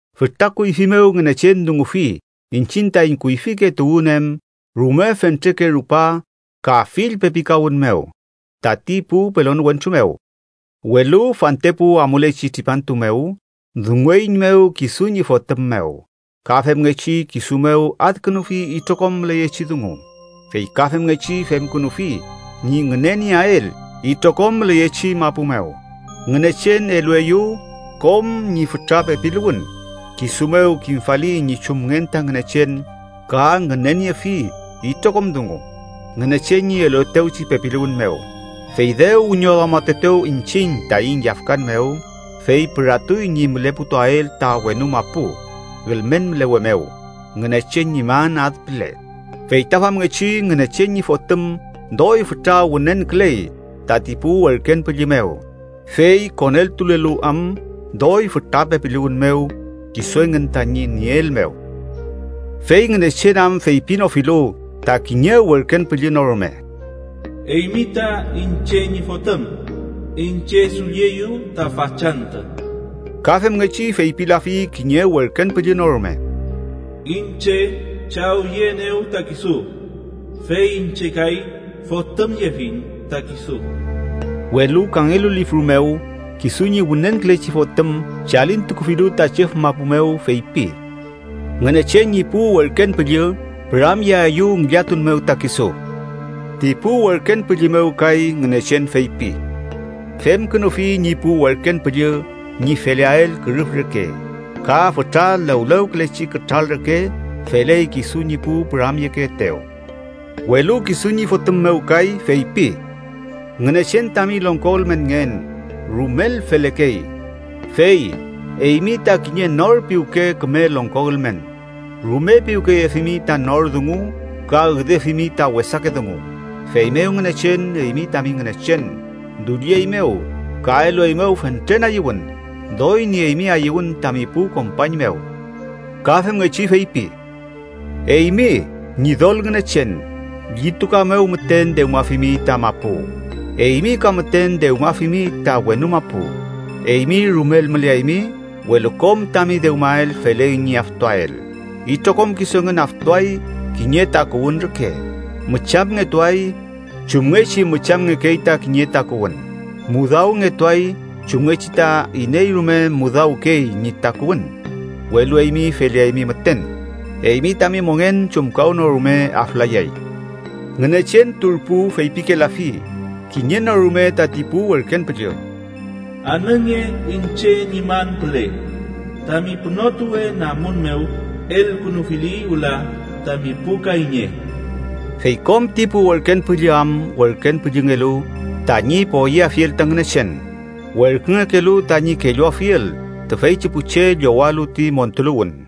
Fütra kuyfi mew Ngünechen dungufi iñchiñ taiñ kuyfike tuwün em rume fentreke rupa ka fill pepikawün mew tati pu pelon wentru mew. Welu fantepu amulechi tripantu mew, dungueiñmew kisu ñi Fotüm mew. Ka femngechi kisu mew adkünufi itrokom müleyechi dungu, fey ka femngechi femkünufi ñi ngünenieael itrokom müleyechi mapu mew. Ngünechen elueyew kom ñi fütra pepiluwün, kisu mew kimfali ñi chumngen ta Ngünechen ka ngüneniefi itrokom dungu Ngünechen ñi eluetewchi pepiluwün mew. Fey dew wiñoduamatuetew iñchiñ taiñ yafkan mew, fey püratuy ñi müleputuael ta wenu mapu ülmen mülewe mew Ngünechen ñi man ad püle. Fey ta famngechi Ngünechen ñi Fotüm doy fütra wünenküley tati pu werken püllü mew, fey koneltulelu am doy fütra pepiluwün mew kisu engün tañi nieel mew. Fey Ngünechen am feypinofilu ta kiñe werken püllü no rume: “Eymi ta iñche ñi Fotüm: Iñche dullieyu ta fachantü.” Ka femngechi feypilafi kiñe werken püllü no rume: “Iñche chawyeenew ta kisu, fey iñche kay fotümyefiñ ta kisu.” Welu kangelu lifru mew, kisu ñi wünenkülechi Fotüm chalintukufilu ta chüf mapu mew, feypi: “Ngünechen ñi pu werken püllü püramyeaeyew ngillatun mew ta kisu.” Ti pu werken püllü mew kay Ngünechen feypi: “Femkünufi ñi pu werken püllü ñi feleael kürüf reke. Ka fütra lewlewkülechi kütral reke feley kisu ñi pu püramyekeetew.” Welu kisu ñi Fotüm mew kay, feypi: “Ngünechen tami longko ülmenngen rumel felekey, fey eymi ta kiñe nor piwke küme longko ülmen. Rume piwkeyefimi ta nor dungu ka üdefimi ta wesake dungu. Feymew Ngünechen, eymi tami Ngünechen, dullieymew ka elueymew fentren ayüwün, doy nieymi ayüwün tami pu kompañ mew.” Ka femngechi feypi: “Eymi, Ñidol Ngünechen, llituka mew müten dewmafimi ta mapu. Eymi ka müten dewmafimi ta wenu mapu. Eymi rumel müleaymi, welu kom tami dewmael feley ñi aftuael. Itrokom kisu engün aftuay kiñe takuwün reke. ¡Müchamngetuay chumngechi müchamngekey ta kiñe takuwün. Mudawngetuay chumngechi ta iney rume mudawkey ñi takuwün! Welu eymi feleaymi müten. Eymi tami mongen chumkawnorume aflayay.” Ngünechen turpu feypikelafi kiñe no rume tati pu werken püllü: “Anünge iñche ñi man püle. Tami pünotuwe namun mew elkünufili wüla tami pu kayñe.” Fey kom ti pu werken püllü am werken püllüngelu tañi poyeafiel ta Ngünechen, werküngekelu tañi kelluafiel tüfeychi pu che llowalu ti montuluwün.